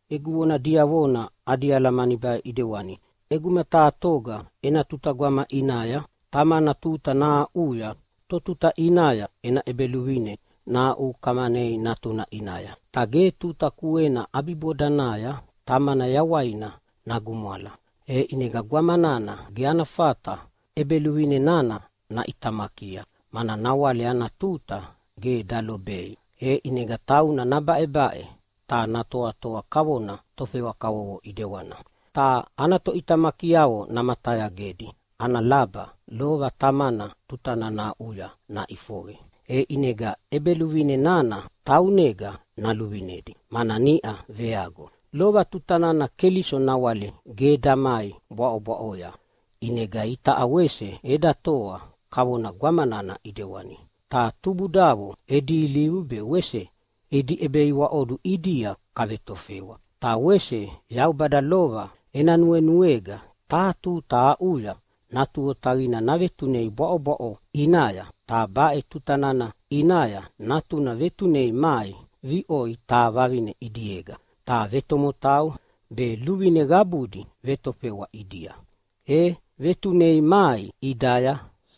Egu vona diavona adi alamani baʼe ʼidewani: ʼEguma taha toga ena tuta gwama ʼinaya tamana tuta nahaʼuya totuta ʼinaya ena ʼebeluvine nahaʼukamanei natuna ʼinaya, ta ge tuta kuena ʼabibodanaya tamana yawaina nagumwala, e ʼinega gwama nana ge ana fata ʼebeluvine nana naʼitamakia, mana nawale ana tuta ge dalobei. E ʼinega tauna nabaʼebaʼe ta natoatoa kavona tofewa kavovo ʼidewana, ta ana toʼitamakiavo namatayagedi ana laba lova tamana tuta nana aʼuya naʼifoqe, e ʼinega ʼebeluvine nana taunega naluvinedi, mana niʼa veago. Lova tuta nana Keliso nawale ge damai bwaʼobwaʼoya, ʼinega itaʼa wese eda toa kavona gwama nana ʼidewani, ta tubudavo edi ilivu be wese edi ʼebeiwaʼodu ʼidia kavetofewa. Ta wese Yaubada lova ena nuenuega taha tuta aʼuya Natu Otaqina navetunei bwaʼobwaʼo ʼinaya. Ta baʼe tuta nana ʼinaya Natuna vetunei mai viʼoi taha vavine ʼinega, ta vetomotau be luvine qabudi vetofewa ʼidia. E vetunei mai ʼidaya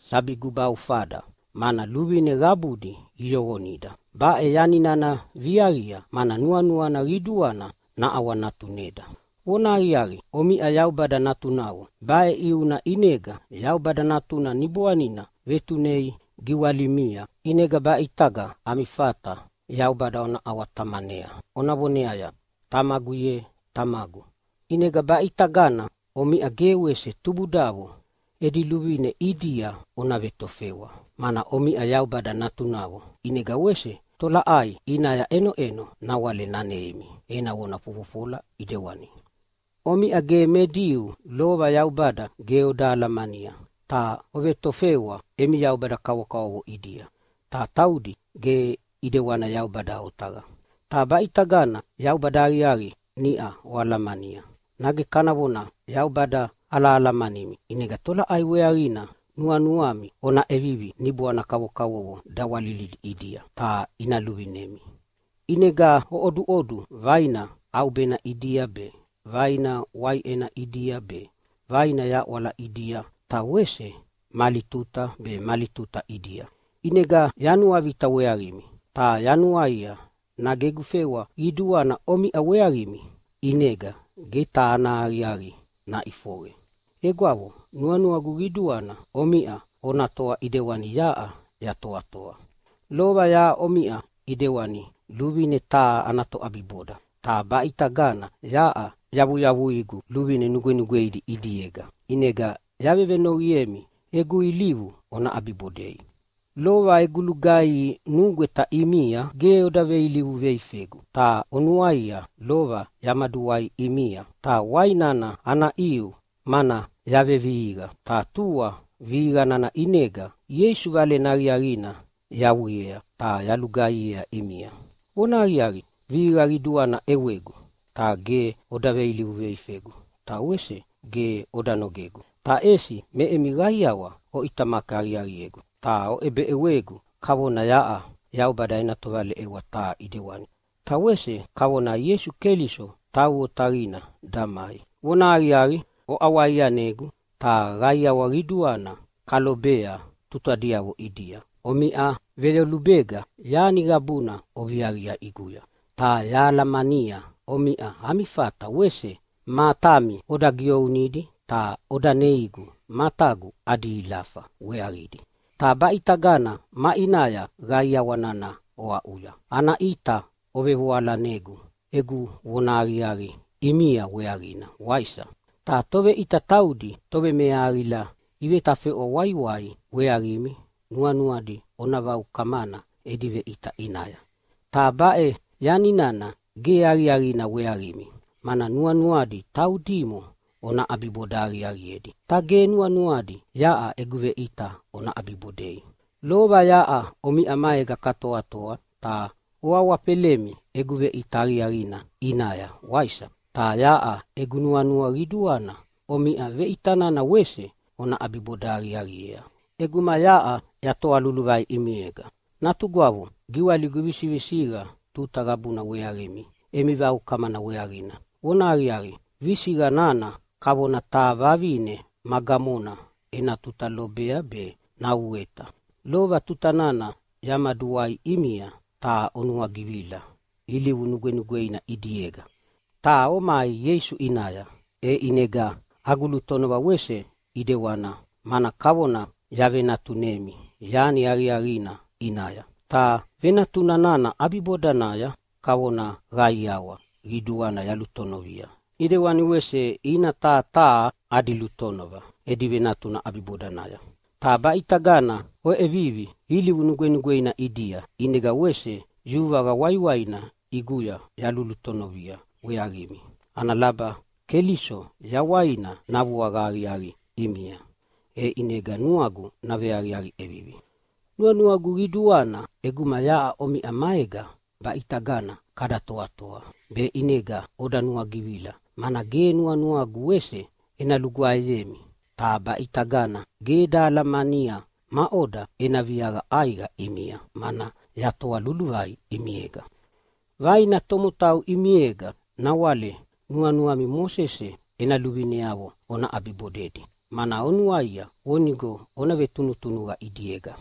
sabi gubaufada, mana luvine qabudi iyoqonida. Baʼe yani nana viaqia, mana nuanuana qiduana naʼawanatuneda. Vonahaqiaqi, omiʼa Yaubada natunavo. Baʼe ʼiuna ʼinega Yaubada Natuna Niboanina vetunei giwalimia, ʼinega baʼitaga ami fata Yaubada ona ʼawa-Tamanea ona voneaya, “Tamagu ye, Tamagu!” ʼInega baʼitagana omiʼa ge wese tubudavo edi luvine ʼidia ona vetofewa, mana omiʼa Yaubada natunavo. ʼInega wese tolaʼai ʼinaya ʼenoʼeno nawale naneimi ena vona fofofola ʼidewani. Omiʼa ge me Diu lova Yaubada ge oda alamania, ta ovetofewa emi yaubada kavokavovo ʼidia, ta taudi ge ʼidewani Yaubada otaqa. Ta baʼitaga Yaubada aqiaqi niʼau oalamania — nage kana vona Yaubada alahalamanimi — ʼinega tolaʼai weaqina nuanuami ona ʼevivi niboana kavokavovo dawalilidi ʼidia, ta ina luvinemi? ʼInega oʼoduʼodu vaina ʼaubena ʼidia be, vaina waiʼena ʼidia be, vaina yaʼwala ʼidia ta wese mali tuta be mali tuta ʼidia. ʼInega yanuavita weaqimi, ta yanuaia nage egu fewa qiduana omiʼa weaqimi ʼinega ge taha ana aqiaqi naʼifoqe. Egwavo, nuanuagu qiduana omiʼa ona toa ʼidewani yaʼa yatoatoa. Lova yaʼa omiʼa ʼidewani luvine taha ana toʼabiboda, ta baʼe ʼitaga yaʼa yavuyavuigu luvine nugwenugweidi ʼidiega, ʼinega yavenoqiemi egu ilivu ona ʼabibodei. Lova egu lugaihi nugweta ʼimia ge oda veilivu veifegu. Ta ona nuaia, lova yamaduwai ʼimia, ta wai nana ana ʼiu mana yavevihiqa, ta tua vihiqa nana ʼinega Ieisu Valena Aqiaqina yawiea ta yalugaihiea ʼimia. Vonahaqiaqi, vihiqa qiduana ʼewegu, ta ge oda veilivu veifegu ta wese ge oda nogegu. Ta ʼesi me emi qaiawa oʼitamaki aqiaqiegu ta oʼebeʼewegu kavona yaʼa Yaubada ena tovaleʼewa taha ʼidewani, ta wese kavona Ieisu Keliso tau otaqina damai. Vonahaqiaqi, oʼawaianegu ta qaiawa qiduana kalobea tutadiavo ʼidia. Omiʼa veyolubega yani qabuna oviaqia ʼiguya, ta yahalamania omiʼa ami fata wese matami oda ʼegiounidi ta oda neigu matagu adi ilafa weaqidi. Ta baʼitaga maʼinaya qaiawa nana oaʼuya? Ana ʼita ovevoalanegu egu vonahaqiaqi ʼimia weaqina, waisa? Ta toveʼita taudi tovemeahaqila ivetafeʼwa waiwai weaqimi nuanuadi ona vaukamana edi veʼita ʼinaya. Ta baʼe yani nana ge aqiaqina weaqimi, mana nuanuadi taudimo ona ʼabiboda aqiaqiedi, ta ge nuanuadi yaʼa egu veʼita ona ʼabibodei. Lova yaʼa omiʼa maega katoatoa ta oawafelemi egu veʼita aqiaqina ʼinaya, waisa? Ta yaʼa egu nuanua qiduana omiʼa veʼita nana wese ona ʼabiboda aqiaqiea ʼeguma yaʼa yatoa luluvai ʼimiega. Natugwavo, giwaligu visivisiqa tuta qabuna weaqimi emi vaukamana weaqina. Vonahaqiaqi, visiqa nana kavona taha vavine ma gamona ena tuta lobea be nauweta. Lova tuta nana yamaduwai ʼimia ta onuagivila ilivu nugwenugweina ʼidiega ta omai Ieisu ʼinaya, e ʼinega agu lutonova wese ʼidewana, mana kavona yavenatunemi yani aqiaqina ʼinaya. Ta venatuna nana ʼabibodanaya kavona qaiawa qiduana yalutonovia, ʼidewani wese ina taha taha adi lutonova edi venatuna ʼabibodanaya. Ta baʼitagana oʼevivi ilivu nugwenugweina ʼidia, ʼinega wese yuvaqa waiwaina ʼiguya yalulutonovia weaqimi ana laba Keliso yawaina navuaqa aqiaqi ʼimia, e ʼinega nuagu naveaqiaqi ʼevivi. Nuanuagu qiduana ʼeguma yaʼa omiʼa maega baʼitaga kada toatoa, be ʼinega oda nuagivila, mana ge nuanuagu wese ena lugwaeyemi. Ta baʼitagana ge eda alamania maʼoda ena viaqa ʼaiqa ʼimia, mana yatoa luluvai ʼimiega. Vaina tomotau ʼimiega nawale nuanuami Mosese ena luvineavo ona ʼabibodedi, mana onuaia vonigo ona vetunutunuqa ʼidiega.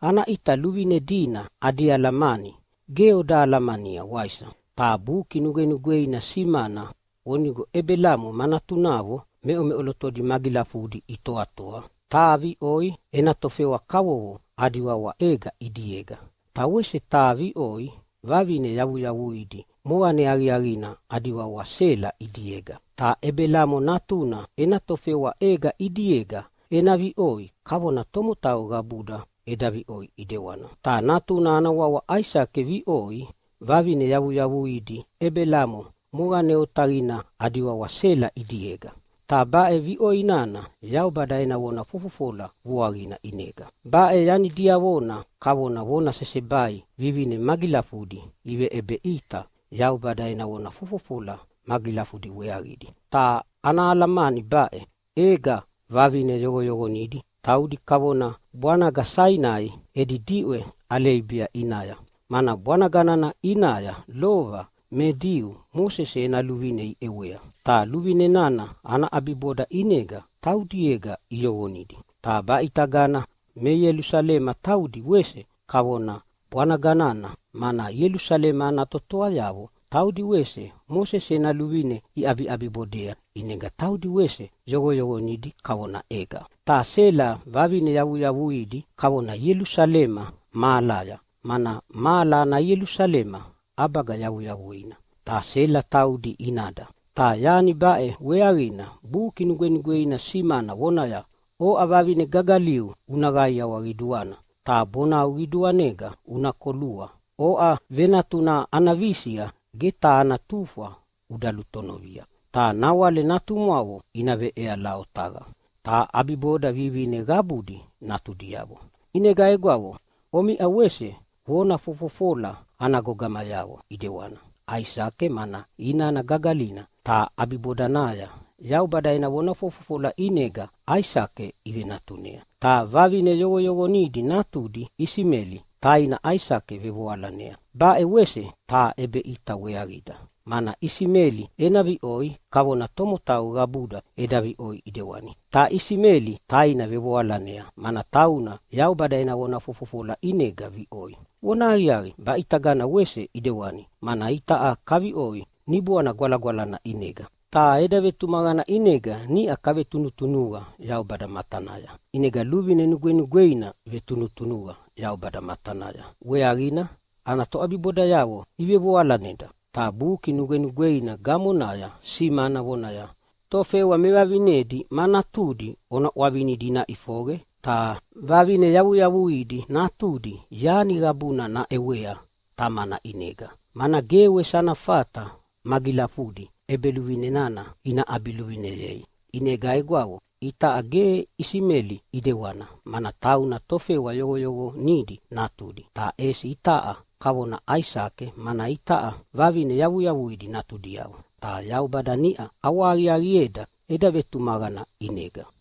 Ana ʼita luvine dina adi alamani ge oda alamania, waisa? Ta Buki Nugwenugweina simana vonigo Ebelamo ma natunavo meʼomeʼolotodi magilafudi itoatoa. Taha viʼoi ena tofewa kavovo adi wawa Ega ʼidiega, ta wese taha viʼoi vavine yavuyavuidi moqane aqiaqina adi wawa Sela ʼidiega. Ta Ebelamo natuna ena tofewa Ega ʼidiega ena viʼoi kavona tomotau qabuda eda viʼoi ʼidewana. Ta natuna ana wawa Aisake viʼoi vavine yavuyavuidi Ebelamo moqane otaqina adi wawa Sela ʼidiega. Ta baʼe viʼoi nana Yaubada ena vona fofofola vuaqina ʼinega. Baʼe yani diavona kavona vona sesebai. Vivine magilafudina iveʼebeʼita Yaubada ena vona fofofola magilafudi weaqidi, ta ana alamani baʼe: Ega vavine yoqoyoqonidi, taudi kavona bwanaga Sainai edi diʼwe Aleibia ʼinaya, mana bwanaga nana ʼinaya lova me Diu Mosese ena luvine iʼewea, ta luvine nana ana ʼabiboda ʼinega taudiega iyoqonidi. Ta baʼitagana me Ielusalema taudi wese kavona bwanaga nana, mana Ielusalema ana totoayavo taudi wese Mosese ena luvine iʼabiʼabibodea, ʼinega taudi wese yoqoyoqonidi kavona Ega. Ta Sela vavine yavuyavuidi kavona Ielusalema mahalaya, mana mahala ana Ielusalema ʼabaga yavuyavuina, ta Sela taudi inada. Ta yani baʼe weaqina Buki Nugwenugweina simana vonaya, “Oʼa vavine gagaliu, una qaiawa qiduana, ta bonau qiduanega una kolua. Oʼa venatuna ana visiqa ge taha ana tufwa uda lutonovia. Ta nawale natumwavo ina veʼeala otaqa, ta ʼabiboda vivine qabudi natudiavo.” ʼInega egwavo, omiʼa wese vona fofofola ana gogamayavo ʼidewana Aisake, mana inana gagalina, ta ʼabibodanaya Yaubada ena vona fofofola ʼinega Aisake ivenatunea. Ta vavine yoqoyoqonidi natudi Isimeli taina Aisake vevoalanea. Baʼe wese taha ʼebeʼita weaqida, mana Isimeli ena viʼoi kavona tomotau qabuda eda viʼoi ʼidewani. Ta Isimeli taina vevoalanea, mana tauna Yaubada ena vona fofofola ʼinega viʼoi. Vonahaqiaqi, baʼitagana wese ʼidewani, mana itaʼa kaviʼoi Niboana Gwalagwalana ʼinega, ta eda vetumaqana ʼinega niʼa kavetunutunuqa Yaubada matanaya, ʼinega luvine nugwenugweina vetunutunuqa Yaubada matanaya weaqina ana toʼabibodayavo ivevoalaneda. Ta Buki Nugwenugweina gamonaya simana vonaya, “Tofewa mevavinedi ma natudi ona ʼwavinidi ina ʼifoqe! Ta vavine yavuyavuidi natudi yani qabuna naʼewea tamana ʼinega, mana ge wese ana fata magilafudi ʼebeluvine nana ina ʼabiluvineyei.” ʼInega egwavo, itaʼa ge Isimeli ʼidewana, mana tauna tofewa yoqoyoqonidi natudi. Ta ʼesi itaʼa kavona Aisake, mana itaʼa vavine yavuyavuidi natudiavo, ta Yaubada niʼa ʼawahaqiaqieda eda vetumaqana ʼinega.